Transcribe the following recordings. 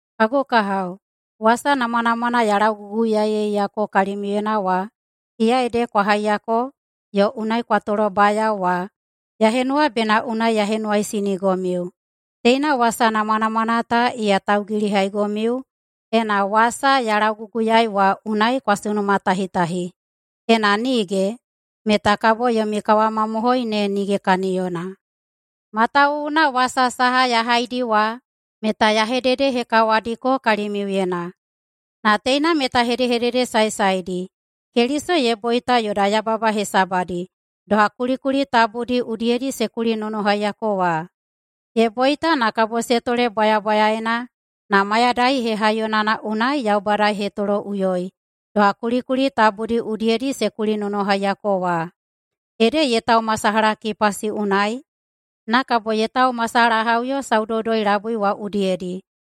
Kagu kahao, wasa namwanamwana ya lauguguyaeiyako kalimiuyena wa, iya ede kwa haiyako yo unai kwa tolobayao wa, ya henuwa bena unai ya henuwaisinigomiu. Teina wasa namwanamwana ta iya taugilihaigomiu, ena wasa ya lauguguyaei wa unai kwa sunumatahitahi. Ena nige, meta kabo yomi kawamamohoi ne nige kaniyona. Matawuwuna wasa saha ya haidi wa meta ya hededehekawadiko kalimiuyena, na teina meta hedehedede saesaedi: Keliso ye boita yoda yababa hesabadi, doha kulikuli tabudi udiyedi se kulinonohaiyako wa. Ye boita na kabo se tole bwayabwayaena, na mayadai hehaiyonana unai Yaubada ye hetoloꞌuyoi, doha kulikuli tabudi udiyedi se kulinonohaiyako wa. Ede ye taumasalaha Kipasi unai na kabo ye taumasalahaꞌuyo saudoudoi-labui wa udiyedi.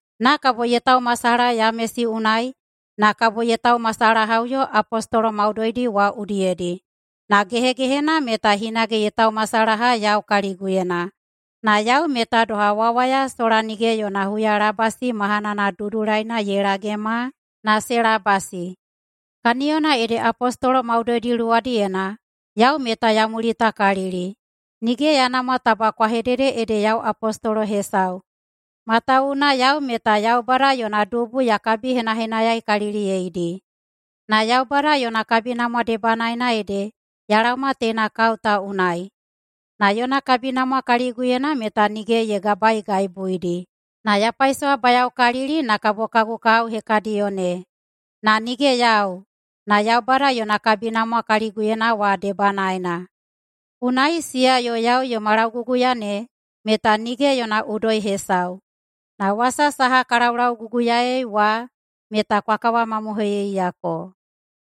Na kabo ye taumasalaha Yamesi unai, na kabo ye taumasalahaꞌuyo apostolo maudoidi wa udiyedi. Na gehegehena meta hinage ye taumasalaha yau kaliguyena, na yau meta doha wawaya sola nige yona huyalabasi mahanana dudulaina ye lagema na se labasi. Kaniyona ede apostolo maudoidi luwadiyena yau meta ya mulitakalili. Nige ya namwa taba kwa hedede ede yau apostolo hesau, matawuwuna yau meta Yaubada yona dubu ya kabihenahenayaikaliliyeidi. Na Yaubada yona kabinamwa debanaena ede ya laoma teina kao ta unai, na yona kabinamwa kaliguyena meta nige ye gabaegaibuidi, na ya paisowabayaokalili na kabo kagu kahao hekadiyo ne. Na nige yau, na Yaubada yona kabinamwa kaliguyena wa debanaena. Unai siya yo yau yoma lauguguya ne meta nige yona udoi hesau, na wasa saha ka laulauguguyaei wa meta kwa kawamamohoiyeiyako.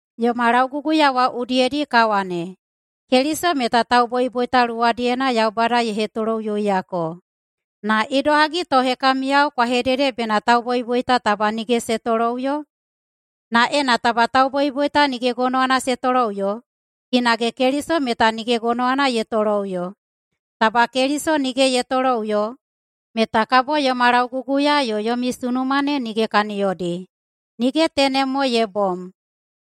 Yoma lauguguya wa udiyedi ka wane, Keliso meta tauboiboita luwadiyena Yaubada ye hetoloꞌuyoiyako. Na idohagi to hekamiyao kwa hedede bena tauboiboita taba nige se toloꞌuyo? Na ena taba tauboiboita nige gonowana se toloꞌuyo, hinage Keliso meta nige gonowana ye toloꞌuyo. Taba Keliso nige ye toloꞌuyo meta kabo yoma lauguguya yo yomi sunuma ne nige kaniyodi. Nige tenem mo ye bom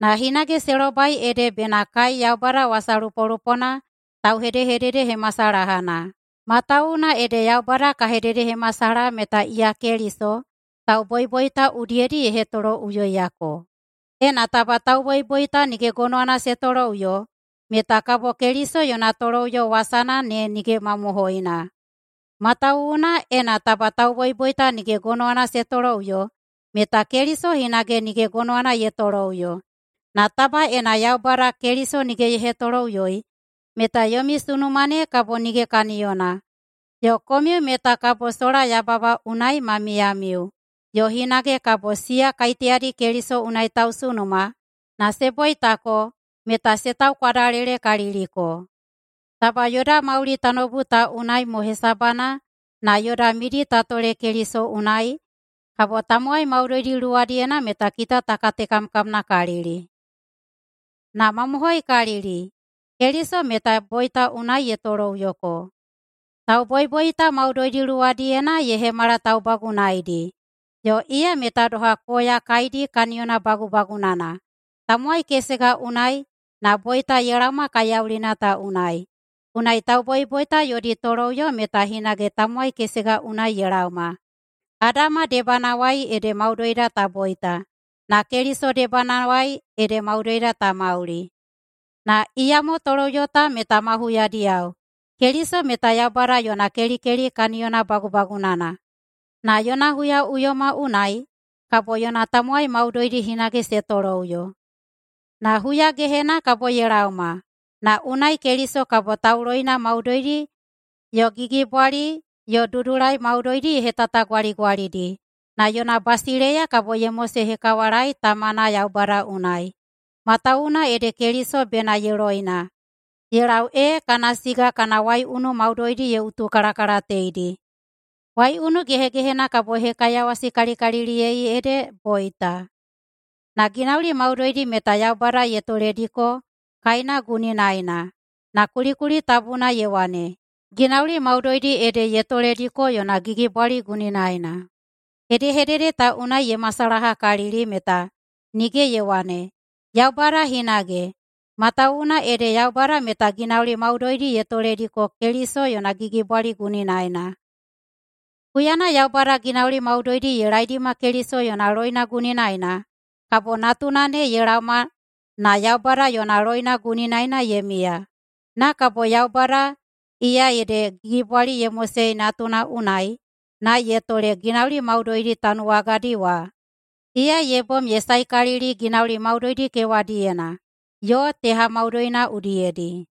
na hinage se lobai ede bena kai Yaubada wasalupolupona tauhedehededehemasalahana, matawuwuna ede Yaubada ka hededehemasalaha meta iya Keliso tauboiboita udiyedi ye hetoloꞌuyoiyako. Ena taba tauboiboita nige gonowana se toloꞌuyo meta kabo Keliso yona toloꞌuyo wasana ne nige mamohoina. Matawuwuna, ena taba tauboiboita nige gonowana se toloꞌuyo meta Keliso hinage nige gonowana ye toloꞌuyo. Na taba ena Yaubada Keliso nige ye hetoloꞌuyoi meta yomi sunuma ne kabo nige kaniyona, yo komiu meta kabo sola yababa unai ma miyamiu, yo hinage kabo siya kaiteyadi Keliso unai tausunuma na se boitako meta se taukwadalelekaliliko. Taba yoda mauli tanoubu ta unai mo hesabana na yoda midi ta tole Keliso unai, kabo tamowai maudoidi luwadiyena meta kita ta katekamkamnakalili. Na mamohoikalili Keliso meta boita unai ye toloꞌuyoko. Tauboiboita maudoidi luwadiyena ye hemala taubagunaidi, yo iya meta doha koya kaidi kaniyona bagubagunana. Tamowai kesega unai na boita ye laoma kaiyaulina ta unai, unai tauboiboita yodi toloꞌuyo meta hinage tamowai kesega unai ye laoma. Adama debanawai ede maudoida ta boita, na Keliso debanawai ede maudoida ta mauli. Na iyamo toloꞌuyo ta meta ma huyadiyao. Keliso meta Yaubada yona kelikeli kaniyona bagubagunana, na yona huyaꞌuyoma unai kabo yona tamowai maudoidi hinage se toloꞌuyo. Na huyagehena kabo ye laoma, na unai Keliso kabo tauloina maudoidi yo gigibwali yo dudulai maudoidi ye hetatagwaligwalidi na yona basileiya kabo ye mosehekawalaei Tamana Yaubada unai. Matawuwuna ede Keliso bena ye loina ye lau ee kana siga kana waiunu maudoidi ye utukalakalateidi. Waiunu gehegehena kabo ye hekaiyawasikalikaliliyei ede boita. Na ginauli maudoidi meta Yaubada ye tolediko kaena guninaena. Na kulikuli tabuna ye wane, “Ginauli maudoidi ede ye tolediko yona gigibwali guninaena.”. Hedehedede ta unai ye masalahakalili meta nige ye wane, Yaubada hinage, matawuwuna ede Yaubada meta ginauli maudoidi ye toledi Keliso yona gigibwali guninaena. Huyana Yaubada ginauli maudoidi ye laeidima Keliso yona loina guninaena, kabo natuna ne ye laoma na Yaubada yona loina guninaena ye miya. Na kabo Yaubada, iya ede gigibwali ye mosei Natuna unai na ye tole ginauli maudoidi tanuwagadi wa, iya ye bom ye saekalili ginauli maudoidi kewadiyena yo teha maudoina udiyedi.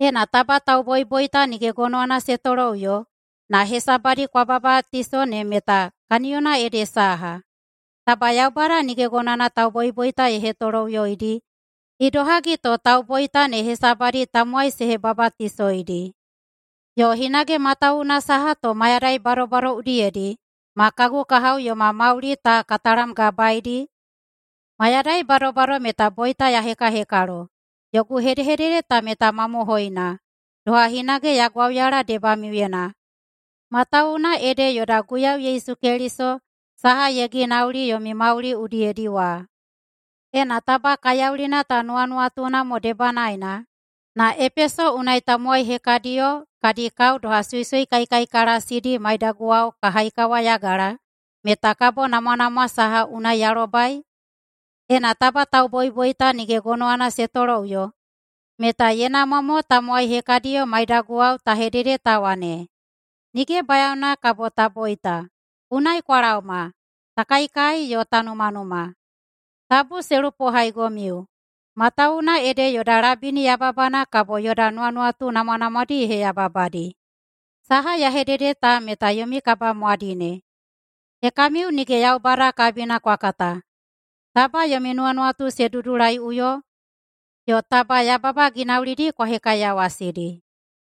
Ena taba tauboiboita nige gonowana se toloꞌuyo, na hesabadi kwa babatiso ne meta kaniyona ede saha? Taba Yaubada nige gonowana tauboiboita ye hetoloꞌuyoidi, idohagi to tauboita ne hesabadi tamowai se hebabatisoidi? Yo hinage, matawuwuna saha to mayadai badobado udiyedi ma kagu kahao yoma mauli ka talamgabaeidi? Mayadai badobado meta boita ya hekahekalo. Yogu hedehedede ta meta mamohoina, doha hinage ya gwauyala debamiuyena, matawuwuna ede yoda Guiyau Yesu Keliso saha ye ginauli yomi mauli udiyedi wa. Ena taba kaiyaulina ta nuwanuwatuna mo debanaena na Epeso unai tamowai hekadiyo kadi kao doha suisui kaikaikalasidi maiyaguwao ka haikawayagala meta kabo namwanamwa saha unai ya lobai? Ena taba tauboiboita nige gonowana se toloꞌuyo, meta ye namwa mo tamowai hekadiyo maiyadao ta hedede ta wane, “Nige bayaona kabo ta boita. Unai kwa laoma, ta kaikai yo ta numanuma.” Tabu se lupohaigomiu matawuwuna ede yoda labini yababana kabo yoda nuwanuwatu namwanamwadi ye heyababadi. Saha ya hedede ta meta yomi kabamwadine: Hekamiu nige Yaubada kabina kwa kata. Taba yomi nuwanuwatu se dudulaiꞌuyo, yo taba yababa ginaulidi kwa hekaiyawasidi!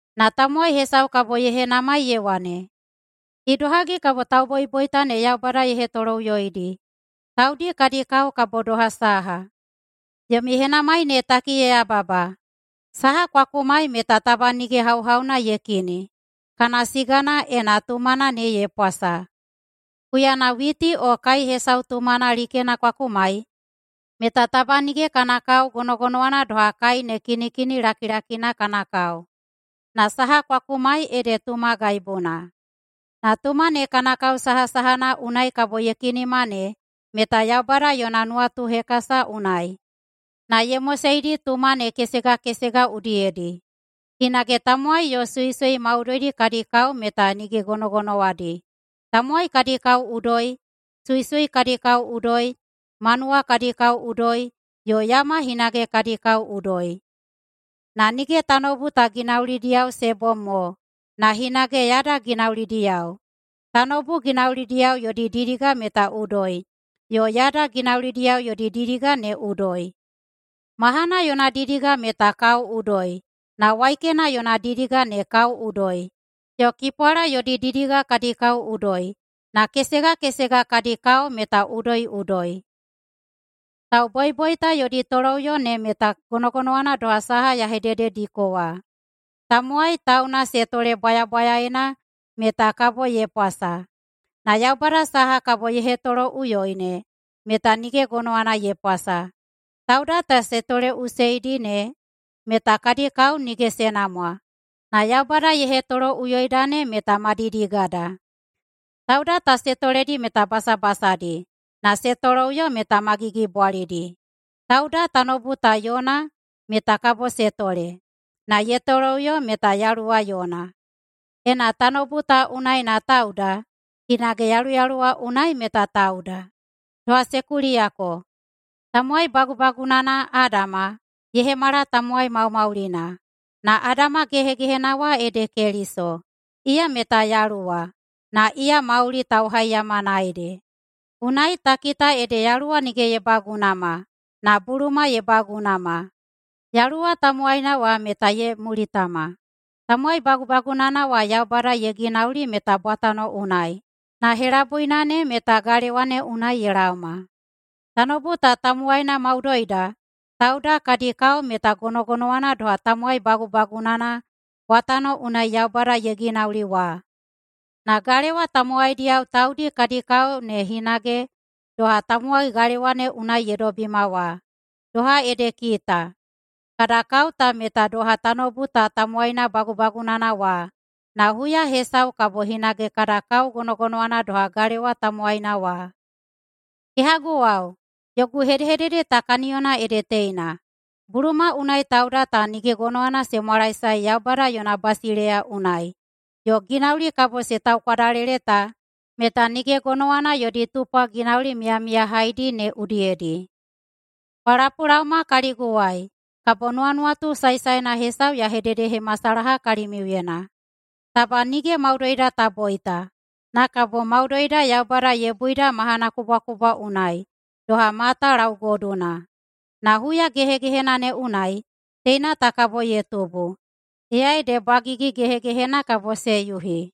Na tamowai hesau kabo ye henamai ye wane, “Idohagi kabo tauboiboita ne Yaubada ye hetoloꞌuyoidi? Taudi kadi kao kabo doha saha?” Yomi henamai ne taki ye yababa! Saha kwa kumai meta taba nige hauhauna ye kini kana sigana ena tumana ne ye pwasa. Huyana witi o kai hesau tumana likena kwa kumai meta taba nige kana kao gonogonowana doha kai ne kinikini lakilakina kana kao, na saha kwa kumai ede tuma gaibuna. Na tuma ne kana kao sahasahana unai kabo ye kinima ne meta Yaubada yona nuwatuhekasa unai na ye moseidi tuma ne kesegakesega udiyedi. Hinage tamowai yo suisui maudoidi kadi kao meta nige gonogonowadi. Tamowai kadi kao udoi, suisui kadi kao udoi, manuwa kadi kao udoi, yo yama hinage kadi kao udoi. Na nige tanoubu ta ginaulidiyao se bom mo na hinage yada ginaulidiyao. Tanoubu ginaulidiyao yodi didiga meta udoi, yo yada ginaulidiyao yodi didiga ne udoi. Mahana yona didiga meta kao udoi, na waikena yona didiga ne kao udoi, yo kipwala yodi didiga kadi kao udoi. Na kesega kesega kadi kao meta udoiꞌudoi. Tauboiboita yodi toloꞌuyo ne meta gonogonowana doha saha ya hededediko wa. Tamowai tauna se tole bwayabwayaena meta kabo ye pwasa, na Yaubada saha kabo ye hetoloꞌuyoi ne meta nige gonowana ye pwasa. Tauda ta se toleꞌuseidi ne meta kadi kao nige se namwa, na Yaubada ye hetoloꞌuyoida ne meta ma didigada. Tauda ta se toledi meta basabasadi, na se toloꞌuyo meta ma gigibwalidi. Tauda tanoubu ta yona meta kabo se tole, na ye toloꞌuyo meta yaluwa yona. Ena tanoubu ta unai na tauda, hinage yaluyaluwa unai meta tauda. Doha se kuliyako, tamowai bagubagunana, Adama, “ye hemala tamowai maumaulina”. Na Adama gehegehena wa ede Keliso, iya meta yaluwa, na iya mauli tauhaihaiyamana ede. Unai ta kita ede yaluwa nige ye bagunama, na buluma ye bagunama. Yaluwa tamowaina wa meta ye mulitama. Tamowai bagubagunana wa Yaubada ye ginauli meta bwatano unai, na helabuina ne meta galewa ne unai ye laoma. Tanoubu ta tamowaina maudoida tauda kadi kao meta gonogonowana doha tamowai bagubagunana bwatano unai Yaubada ye ginauli wa. Na galewa tamowaidiyao taudi kadi kao ne hinage doha tamowai galewa ne unai ye dobima wa. Doha ede kita, kada kao ta meta doha tanoubu ta tamowaina bagubagunana wa, na huya hesau kabo hinage kada kao gonogonowana doha galewa tamowaina wa. Kehaguwao, yogu hedehedede ta kaniyona ede teina: Buluma unai tauda ta nige gonowana se mwalaesae Yaubada yona basileiya unai, yo ginauli kabo se taukwadalele ta meta nige gonowana yodi tupwa ginauli miyamiyahaidi ne udiyedi. Kwa lapulaoma kaliguwai, kabo nuwanuwatu saesaena hesau ya hededehemasalaha kalimiuyena: Taba nige maudoida ta boita, na kabo maudoida Yaubada ye buida mahanakubwakubwa unai, doha mata laugoduna. Na huya gehegehena ne unai teina ta kabo ye tubu, iya ede bwagigi gehegehena kabo se yuhi.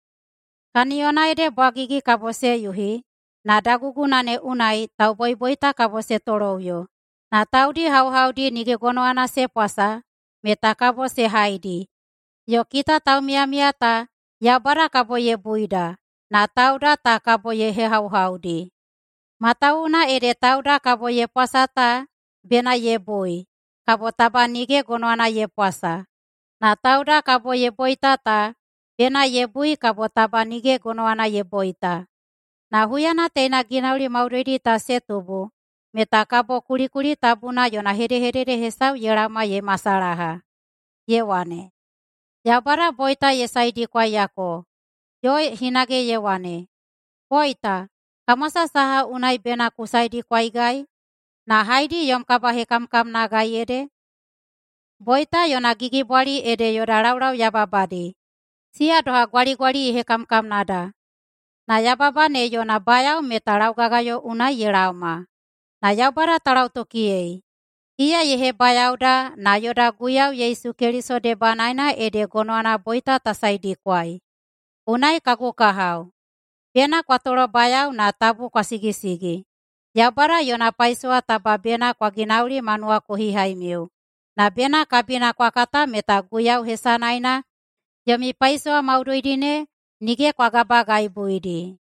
Kaniyona ede bwagigi kabo se yuhi, na daguguna ne unai tauboiboita kabo se toloꞌuyo na taudi hauhaudi nige gonowana se pwasa meta kabo se haidi, yo kita taumiyamiya ta Yaubada kabo ye buida na tauda ta kabo ye hehauhaudi. Matawuwuna ede tauda kabo ye pwasa ta bena ye bui kabo taba nige gonowana ye pwasa, na tauda kabo ye boita ta bena ye bui kabo taba nige gonowana ye boita. Na huyana teina ginauli maudoidi ta se tubu meta kabo kulikuli tabuna yona hedehedede hesau ye laoma ye masalaha, ye wane, “Yaubada boita ye saedikwaiyako.” Yo hinage ye wane, “Boita, kamwasa saha unai bena ku saedikwaigai? Na haedi yom kabahekamkamnagai ede?” Boita yona gigibwali ede yoda laulau yababadi, siya doha gwaligwali ye hekamkamnada, na yababa ne yona bayao meta laugagayo unai ye laoma. Na Yaubada ta lautokiyei! Iya ye hebayaoda na yoda Guiyau Yesu Keliso debanaena ede gonowana boita ta saedikwai. Unai kagu kahao, bena kwa tolobayao na tabu kwa sigisigi! Yaubada yona paisowa taba bena kwa ginauli ma nuwakohihaimiu. Na bena kabina kwa kata meta Guiyau hesanaena yomi paisowa maudoidi ne nige kwa gabagaibuidi.